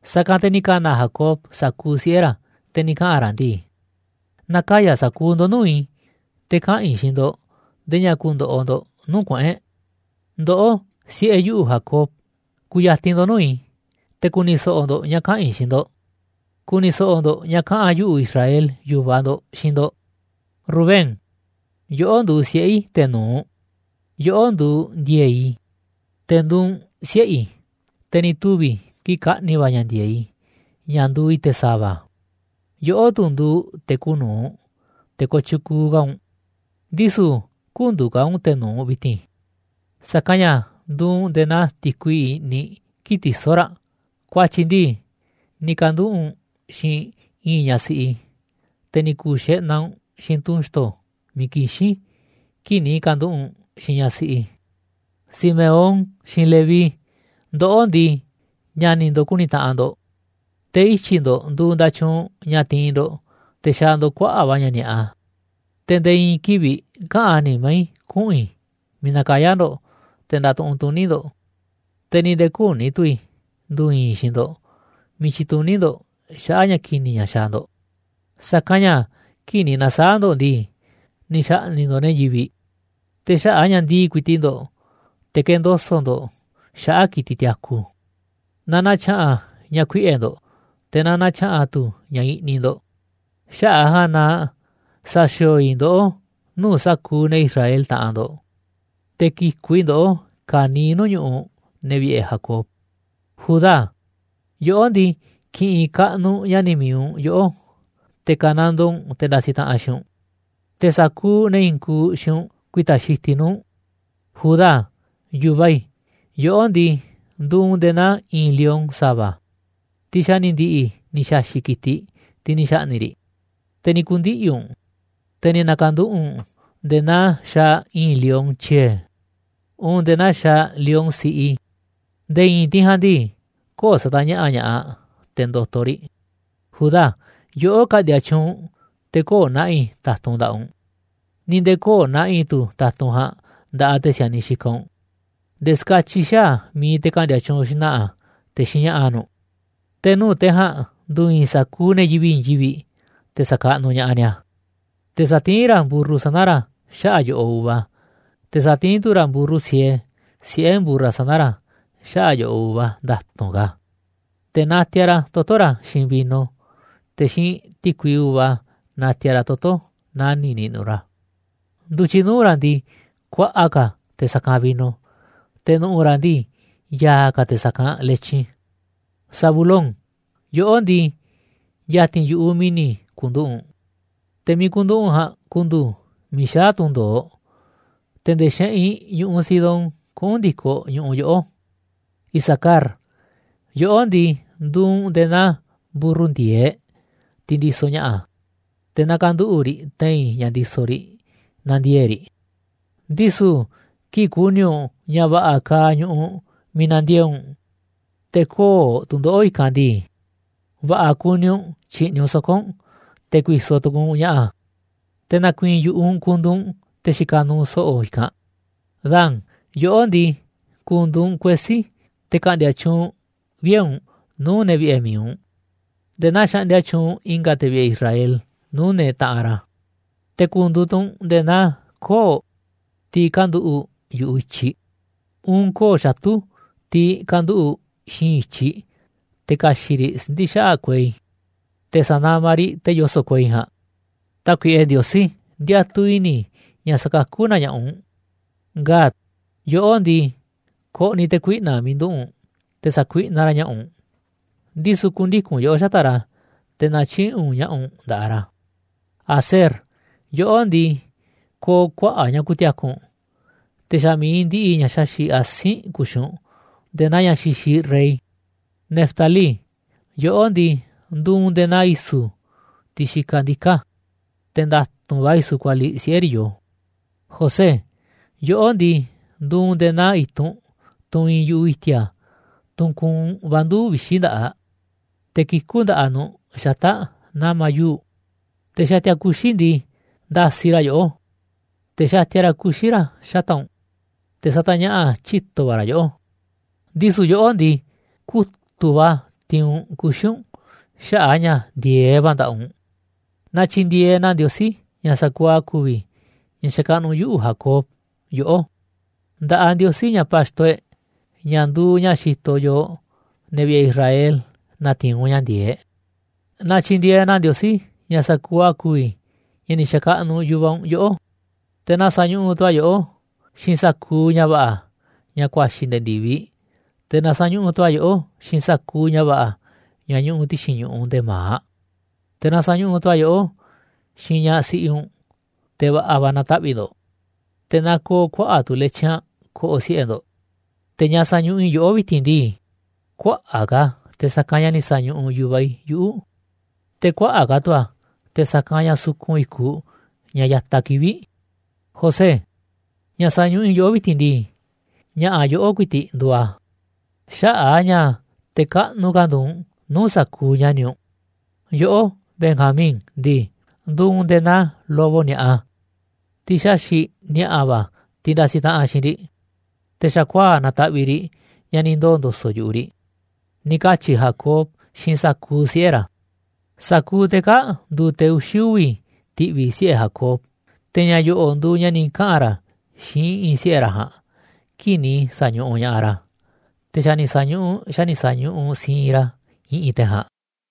Sa̱kanꞌ te̱ ni̱ ka̱na̱ Jacob sa̱kuuꞌ siꞌe̱ ra̱, te̱ ni̱ kaꞌa̱n ra̱ ndii: ―Na̱kaya̱ sa̱kuuꞌ ndo̱ꞌ nuu̱ꞌ i̱, te̱ kaꞌa̱n i̱ xiinꞌ ndo̱ꞌ ndee ña̱ ku̱ndo̱ꞌo̱ ndo̱ꞌ nuu̱ꞌ kuꞌu̱n e̱ꞌ. Ndoꞌó, siꞌe̱ yuꞌu̱, Jacob, ku̱ya̱ti̱n ndo̱ꞌ nuu̱ꞌ i̱, te̱ ku̱ni̱ so̱ꞌo̱ ndo̱ꞌ ña̱ kaꞌa̱n i̱ xiinꞌ ndo̱ꞌ. Ku̱ni̱ so̱ꞌo̱ ndo̱ꞌ ña̱ kaꞌa̱n yuꞌu̱, Israel yu̱vaꞌ ndo̱ꞌ xiinꞌ ndo̱ꞌ. Rubén, yoꞌó nduuꞌ siꞌe̱ i̱ te̱ nu̱uꞌ, yoꞌó nduuꞌ ndi̱e̱e̱ꞌ i̱, te̱ nduuꞌ u̱nꞌ siꞌe̱ i̱, te̱ ni̱ tuvi̱ kii̱ꞌ kaꞌni̱ va̱ ña̱ ndi̱e̱eꞌ i̱ ña̱ nduuꞌ i̱ te̱ sa̱va̱. Yoꞌó tu̱ nduuꞌ te̱ kuuꞌ nu̱uꞌ, te̱ kooꞌ tyukuuꞌ ka̱ u̱nꞌ. Ndisu̱ kü̱ndu̱u̱ ka̱ u̱nꞌ te̱ nu̱uꞌ vi̱ti̱n, sa̱kanꞌ ña̱ nduuꞌ u̱nꞌ nde̱e̱ naa ti̱kui i̱ꞌniꞌ kii̱ꞌ tisó raꞌ, ku̱a̱tyi̱ ndii ni̱ ka̱nduꞌu̱ꞌ u̱nꞌ xiinꞌ i̱i̱n ñaꞌ siꞌi i̱, te̱ ni̱ ku̱u̱ xeꞌnaꞌ u̱nꞌ xiinꞌ tunꞌ xto̱ miiꞌ kixín kii̱ꞌ ni̱ ka̱nduꞌu̱ꞌ u̱nꞌ xiinꞌ ñaꞌ siꞌi i̱. Simeón xiinꞌ Leví, ndoꞌó ndii, ña̱ni̱ ndo̱ꞌ ku̱ni̱ taꞌanꞌ ndo̱ꞌ, te̱ ityi̱ ndo̱ꞌ nduuꞌ nda̱tyuunꞌ ña̱ tiinꞌ ndo̱ꞌ te̱ xaaꞌ ndo̱ꞌ kuaꞌa̱ꞌ va̱ ña̱ ni̱a̱ꞌa. Te̱ nde̱e̱ i̱i̱n kivi̱ꞌ käꞌán nimá i̱ kuꞌu̱n i̱ miiꞌ nakayá ndo̱ꞌ te̱ ndatuꞌunꞌ tuní ndo̱ꞌ, te̱ ni̱ nde̱e̱ küní tu̱ i̱ ndu̱u̱ i̱i̱n i̱ xiinꞌ ndo̱ꞌ miiꞌ tyituní ndo̱ꞌ xaꞌa̱ꞌ ña̱ ki̱ni̱ ña̱ xaaꞌ ndo̱ꞌ. Sa̱kanꞌ ña̱ kii̱ꞌ ni̱ na̱saa̱ꞌ ndo̱ꞌ ndii, ni̱ xa̱ꞌni̱ꞌ ndo̱ꞌ ne̱ yivi̱ꞌ, te̱ xaꞌa̱ꞌ a̱ ña̱ ndii̱ꞌ ku̱i̱ti̱ꞌ ndo̱ꞌ, te̱ kendoso̱ꞌ ndo̱ꞌ xaꞌa̱ꞌ ki̱tiꞌ tiaku. Na na̱tya̱ꞌa̱n ña̱ kuiꞌe̱ ndo̱ꞌ, te̱ na na̱tya̱ꞌa̱n tu̱ ña̱ i̱ꞌniꞌ ndo̱ꞌ. Xaꞌa̱ꞌ a̱ ja̱a̱nꞌ na sa̱xi̱o̱o̱ i̱ ndoꞌó nuu̱ꞌ sa̱kuuꞌ ne̱ Israel taꞌanꞌ ndo̱ꞌ, te̱ ki̱ku̱ꞌ i̱ ndoꞌó ka̱niiꞌ nuu̱ꞌ ñu̱ꞌuꞌ ne̱ vi̱ꞌe̱ Jacob. Judá, yoꞌó ndii, ki̱ꞌi̱n kaꞌnuꞌ ña̱ni̱ mi̱iꞌ u̱nꞌ yoꞌó, te̱ ka̱nandoo u̱nꞌ te̱ ndasiꞌ taꞌanꞌ xiinꞌ u̱nꞌ, te̱ sa̱kuuꞌ ne̱ i̱i̱n kuuꞌ xiinꞌ u̱nꞌ ku̱i̱ta̱ xitiꞌ nuu̱ꞌ u̱nꞌ. Judá, yu̱vaꞌ i̱, yoꞌó ndii, nduuꞌ u̱nꞌ nde̱e̱ naa i̱i̱n lion sa̱va̱, tiꞌ xa̱ ni̱ ndi̱ꞌi̱ ni̱ xa̱xi̱ꞌ ki̱tiꞌ, tiꞌ ni̱ xa̱ꞌni̱ꞌ riꞌ, te̱ ni̱ ku̱ndiꞌi̱ u̱nꞌ, te̱ ni̱ na̱ka̱nduꞌu̱ꞌ u̱nꞌ nde̱e̱ naa xaaꞌ i̱i̱n lion tyie̱, uun nde̱e̱ naa xaaꞌ lion siꞌi, nde̱e̱ i̱i̱n tiꞌ ja̱a̱nꞌ ndii, köo̱ꞌ satañaꞌa̱ꞌ ña̱ꞌaꞌ te̱ ndo̱to̱ riꞌ. Judá, yoꞌó ka̱ꞌndi̱a̱ tyuunꞌ te̱ köo̱ꞌ na̱ꞌi̱ ta̱tunꞌ nda̱ꞌaꞌ u̱nꞌ, ni̱ nde̱e̱ köo̱ꞌ na̱ꞌi̱ tu̱ ta̱tunꞌ ja̱a̱nꞌ nda̱ꞌaꞌ te̱ si̱a̱niꞌ xikaꞌ u̱nꞌ, nde̱e̱ ska̱tyiꞌ xaa̱ mi̱iꞌ te̱ ka̱ꞌndi̱a̱ tyuunꞌ xna̱ꞌa̱, te̱ xiinꞌ ña̱ꞌa̱ nu̱ꞌ. Te̱ nuu̱ꞌ te̱ ja̱a̱nꞌ ndu̱u̱ i̱i̱n sa̱kuuꞌ ne̱ yivi̱ꞌ i̱i̱n yivi̱ꞌ, te̱ sa̱kaꞌnuꞌ ña̱ꞌaꞌ ni̱a̱. Te̱ satiín ra̱ mburru sana̱ ra̱ xaꞌa̱ꞌ yo̱ꞌoꞌ uva, te̱ satiín tu̱ ra̱ mburru siee, siꞌe̱ mburra sana̱ ra̱, xaꞌa̱ꞌ yo̱ꞌoꞌ uva nda̱tu̱nꞌ ka̱. Te̱ natiaꞌ ra̱ toto̱ ra̱ xiinꞌ vino, te̱ xiinꞌ ti̱kui uva, natiaꞌ ra̱ toto̱ nani̱ꞌ niꞌnuꞌ ra̱. Ndu̱tyiꞌ nuu̱ꞌ ra̱ ndii, kuaꞌa ka̱ a̱ te̱ sa̱kanꞌ vino, te̱ nu̱ꞌu̱ ra̱ ndii, ya̱a̱ ka̱ a̱ te̱ sa̱kanꞌ letyin. Zabulón, yoꞌó ndii, ya̱ti̱n yu̱ꞌuꞌ mi̱ni̱ ku̱nduꞌu̱ꞌ u̱nꞌ, te̱ miiꞌ ku̱nduꞌu̱ꞌ u̱nꞌ ja̱a̱nꞌ ku̱ndu̱u̱ miiꞌ xaa̱ tundo̱oꞌ, te̱ nde̱e̱ xeꞌinꞌ ñu̱ꞌuꞌ Sidón kuꞌu̱n ndi̱koꞌ ñu̱ꞌuꞌ yoꞌó. Isacar, yoꞌó ndii, nduuꞌ u̱nꞌ nde̱e̱ naa mburru ndi̱e̱eꞌ, tiꞌ ndisoꞌ ña̱ꞌa̱, te̱ nakanduꞌu̱ꞌ riꞌ te̱i̱n ña̱ ndisoꞌ riꞌ, nandiee̱ꞌ riꞌ. Ndisu̱, kii̱ꞌ ku̱ni̱ u̱nꞌ ña̱ va̱ꞌa̱ kaaꞌ ñu̱ꞌuꞌ miiꞌ na̱ndiee̱ꞌ u̱nꞌ, te̱ köo̱ꞌ tu̱ndoꞌo̱ꞌ i̱kanꞌ ndii, va̱ꞌa̱ kuni u̱nꞌ tyi̱ꞌni̱ u̱nꞌ soko̱ u̱nꞌ te̱ ku̱i̱so̱ tu̱ku̱u̱ u̱nꞌ ña̱ꞌa̱. Te̱ na̱ku̱i̱i̱n yu̱ꞌuꞌ u̱nꞌ ku̱ndu̱u̱ u̱nꞌ te̱ xikaꞌ nuuꞌ so̱ꞌo̱ i̱kanꞌ. Dan, yoꞌó ndii, ku̱ndu̱u̱ u̱nꞌ kuesí, te̱ ka̱ꞌndi̱a̱ tyuunꞌ vie̱ u̱nꞌ nuu̱ꞌ ne̱ vi̱ꞌe̱ mi̱iꞌ u̱nꞌ, nde̱e̱ naa xaꞌndia tyuunꞌ i̱nga̱ te̱ vi̱ꞌe̱ Israel nuu̱ꞌ ne̱ taꞌanꞌ ra̱. Te̱ ku̱ndu̱u̱ tu̱ u̱nꞌ nde̱e̱ naa koo̱ꞌ, tiꞌ kanduꞌu̱ꞌ yu̱ꞌuꞌ i̱tyiꞌ, uun koo̱ꞌ xatu̱, tiꞌ kanduꞌu̱ꞌ xi̱i̱nꞌ i̱tyiꞌ, te̱ ka̱xi̱ꞌ riꞌ siꞌndi̱ xaꞌa̱ꞌ kuei, te̱ sa̱namaꞌ riꞌ te̱ yoso̱ꞌ kuei ja̱a̱nꞌ. Tákuiꞌe Ndiosí, ndiatuꞌ i̱ni̱ i̱ ña̱ sa̱kakú na ña̱ꞌaꞌ u̱n. Gad, yoꞌó ndii, ko̱ꞌni̱ te̱ kuiꞌna̱ꞌ miiꞌ nduꞌu̱ꞌ u̱nꞌ te̱ sa̱kuiꞌnaꞌ ra̱ ña̱ꞌa̱ u̱nꞌ, ndisu̱ ku̱ndiku̱n yoꞌó xata̱ꞌ ra̱, te̱ na̱tyiꞌi̱ꞌ u̱nꞌ ña̱ꞌa̱ u̱nꞌ nda̱ꞌaꞌ ra̱. Aser, yoꞌó ndii, ko̱o̱ kuaꞌa̱ꞌ ña̱ ku̱ti̱a̱ku̱ u̱nꞌ, te̱ xa̱ mi̱iꞌ ndiꞌiꞌ ña̱ xaxi̱ꞌ asi̱nꞌ ku̱xi̱ u̱nꞌ nde̱e̱ naa ña̱ xixiꞌ rey. Neftalí, yoꞌó ndii, nduuꞌ u̱nꞌ nde̱e̱ naa i̱su̱, tiꞌ xikaꞌ ndiká, te̱ nda̱tu̱nꞌ va̱ i̱su̱ kualiꞌ siꞌe̱ riꞌ yoo. José, yoꞌó ndii, nduuꞌ u̱nꞌ nde̱e̱ naa i̱tunꞌ, tunꞌ iinꞌ yu̱ꞌuꞌ i̱ti̱a̱, tunꞌ kuunꞌ va̱ nduu̱ꞌ vixi̱ nda̱ꞌaꞌ, te̱ kikú nda̱ꞌaꞌ nu̱ꞌ xata̱ꞌ nama̱ yuu̱ꞌ. Te̱ xatia kuxi̱ ndii, ndasiꞌ ra̱ yoꞌó, te̱ xatia ra̱ kuxi̱ ra̱ xata̱ꞌ u̱nꞌ, te̱ satañaꞌa̱ꞌ tyito̱ va̱ ra̱ yoꞌó. Ndisu̱ yoꞌó ndii, kutu̱ꞌ va̱ tiinꞌ u̱nꞌ kuxi̱ u̱nꞌ xaꞌa̱ꞌ a̱ ña̱ ndi̱e̱eꞌ va̱ nda̱ꞌaꞌ u̱nꞌ. Na tyi̱ndi̱e̱eꞌ na Ndiosí, ña̱ sa̱kuuꞌ a̱ ku̱vi̱, ña̱ xakaꞌnuꞌ yuꞌu̱ Jacob, yoꞌó. Nda̱ꞌaꞌ Ndiosí, ña̱ pa̱xto e̱ꞌ, ña̱ nduuꞌ ña̱ xitoꞌ yooꞌ ne̱ vi̱ꞌe̱ Israel natiinꞌ u̱nꞌ ña̱ ndi̱e̱eꞌ. Na tyi̱ndi̱e̱eꞌ na Ndiosí, ña̱ sa̱kuuꞌ a̱ ku̱vi̱, ña̱ ni̱ xa̱kaꞌnuꞌ yu̱vaꞌ u̱nꞌ yoꞌó, te̱ na sa̱ñuꞌuꞌ tu̱ a̱ yoꞌó, xiinꞌ sa̱kuuꞌ ña̱ va̱ꞌa̱, ña̱ kuaxi̱ nde̱e̱ ndi̱viꞌ, te̱ na sa̱ñuꞌuꞌ tu̱ a̱ yoꞌó xiinꞌ sa̱kuuꞌ ña̱ va̱ꞌa̱, ña̱ ñuꞌuꞌ ti̱xi̱n ñu̱ꞌuꞌ nde̱e̱ ma̱aꞌ, te̱ na sa̱ñuꞌuꞌ tu̱ a̱ yoꞌó xiinꞌ ñaꞌ siꞌi u̱nꞌ, te̱ va̱ꞌa̱ va̱ na̱taꞌvi̱ꞌ ndo̱ꞌ, te̱ na ko̱o̱ kuaꞌa̱ꞌ tu̱ letyin aꞌ ko̱ꞌo̱ siꞌe̱ ndo̱ꞌ. Te̱ ña̱ sañuꞌuꞌ i̱ yoꞌó vi̱ti̱n ndii, kuaꞌa̱ꞌ ka̱ a̱ te̱ sa̱kanꞌ ña̱ ni̱ sa̱ñuꞌuꞌ yu̱vaꞌ i̱ yuꞌu̱, te̱ kuaꞌa̱ꞌ ka̱ tu̱ a̱ te̱ sa̱kanꞌ ña̱ sukun i̱kuꞌ ña̱ ya̱taꞌ kivi̱ꞌ. José, ña̱ sañuꞌuꞌ i̱ yoꞌó vi̱ti̱n ndii, ña̱ꞌa̱ yoꞌó ku̱i̱ti̱ꞌ nduuꞌ a̱, xaꞌa̱ꞌ a̱ ña̱ te̱ kaꞌnuꞌ ka̱ nduuꞌ u̱nꞌ nuu̱ꞌ sa̱kuuꞌ ña̱ni̱ u̱nꞌ. Yoꞌó, Benjamín ndii, nduuꞌ u̱nꞌ nde̱e̱ naa lobo ni̱a̱ꞌa, tiꞌ xaxi̱ꞌ ni̱a̱ꞌa̱ va̱ tiꞌ ndasiꞌ taꞌanꞌ xiinꞌ riꞌ, te̱ xa̱kuaa̱ꞌ nataꞌviꞌ riꞌ, ña̱ ni̱ ndoo̱ ndo̱so̱ꞌ yu̱ꞌuꞌ riꞌ. Ni̱ katyi̱ Jacob xiinꞌ sa̱kuuꞌ siꞌe̱ ra̱. Sa̱kuuꞌ te̱ kaa̱ꞌ nduuꞌ te̱ uxi̱ uvi̱ ti̱ꞌvi̱ siꞌe̱ Jacob, te̱ ña̱ yo̱ꞌo̱ nduuꞌ ña̱ ni̱ kaꞌa̱n ra̱ xiinꞌ i̱ꞌi̱n siꞌe̱ ra̱ ja̱a̱nꞌ kii̱ꞌ ni̱ sa̱ñuꞌuꞌ ña̱ꞌaꞌ ra̱. Te̱ xa̱ ni̱ sa̱ñuꞌuꞌ xa̱ ni̱ sa̱ñuꞌuꞌ siinꞌ ra̱ i̱ꞌi̱n te̱ ja̱a̱nꞌ.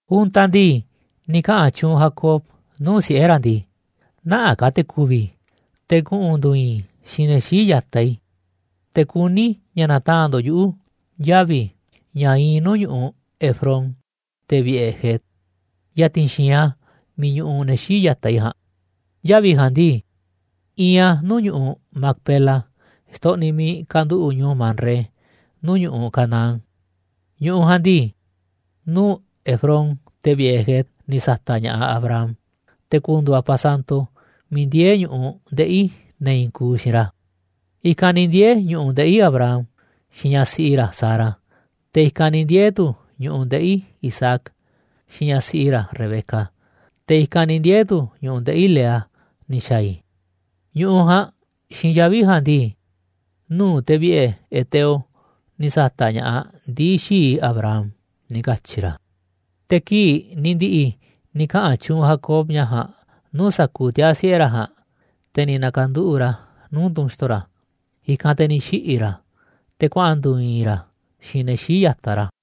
Untaꞌ ndii, ni̱ kaꞌa̱n tyuunꞌ Jacob nuu̱ꞌ siꞌe̱ ra̱ ndii: ―Nä̱ꞌanꞌ ka̱ te̱ ku̱vi̱ i̱, te̱ kuꞌu̱n ndu̱u̱ i̱i̱n i̱ xiinꞌ ne̱ xii̱ꞌ ya̱taꞌ i̱, te̱ kuní i̱ ña̱ na̱taa̱nꞌ ndo̱ꞌ yuꞌu̱ yavi̱ ña̱ iinꞌ nuu̱ꞌ ñu̱ꞌuꞌ Efrón, te̱ vi̱ꞌe̱ Het, ya̱ti̱n xi̱i̱nꞌ a̱ miiꞌ ñuꞌuꞌ ne̱ xii̱ꞌ ya̱taꞌ i̱ ja̱a̱nꞌ. Yavi̱ ja̱a̱nꞌ ndii, iinꞌ a̱ nuu̱ꞌ ñu̱ꞌuꞌ Macpela xtoꞌniꞌ miiꞌ kanduꞌu̱ꞌ ñu̱u̱ Manré nuu̱ꞌ ñu̱ꞌuꞌ Canaán. Ñu̱ꞌuꞌ ja̱a̱nꞌ ndii, nuu̱ꞌ Efrón, te̱ vi̱ꞌe̱ Het ni̱ sa̱ta̱ꞌ ña̱ꞌaꞌ Abraham te̱ ku̱ndu̱u̱ a̱ pasanto miiꞌ ndiee̱ ñu̱ꞌuꞌ ndeꞌi̱ ne̱ i̱i̱n kuuꞌ xiinꞌ ra̱. I̱kanꞌ ni̱ ndiee̱ ñu̱ꞌuꞌ ndeꞌi̱ Abraham, xiinꞌ ñaꞌ siꞌi ra̱ Sara, te̱ i̱kanꞌ ni̱ ndiee̱ tu̱ ñu̱ꞌuꞌ ndeꞌi̱ Isaac, xiinꞌ ñaꞌ siꞌi ra̱ Rebeca, te̱ i̱kanꞌ ni̱ ndiee̱ tu̱ ñu̱ꞌuꞌ ndeꞌi̱ Lea ni̱ xa̱a̱ i̱. Ñu̱ꞌuꞌ ja̱a̱nꞌ xiinꞌ yavi̱ ja̱a̱nꞌ ndii, nuu̱ꞌ te̱ vi̱ꞌe̱ Heteo ni̱ sa̱ta̱ꞌ ña̱ꞌaꞌ ndii̱ xii̱ꞌ i̱ Abraham ―ni̱ katyi̱ ra̱. Te̱ kii̱ꞌ ni̱ ndi̱ꞌi̱ ni̱ kaꞌa̱n tyuunꞌ Jacob ña̱ ja̱a̱nꞌ nuu̱ꞌ sa̱kuuꞌ tiaa̱ siꞌe̱ ra̱ ja̱a̱nꞌ, te̱ ni̱ na̱ka̱nduꞌu̱ꞌ ra̱ nuu̱ꞌ tunꞌ xto̱ ra̱, i̱kanꞌ te̱ ni̱ xiꞌi̱ ra̱, te̱ kuaꞌa̱n ndu̱u̱ i̱i̱n ra̱ xiinꞌ ne̱ xii̱ꞌ ya̱taꞌ ra̱.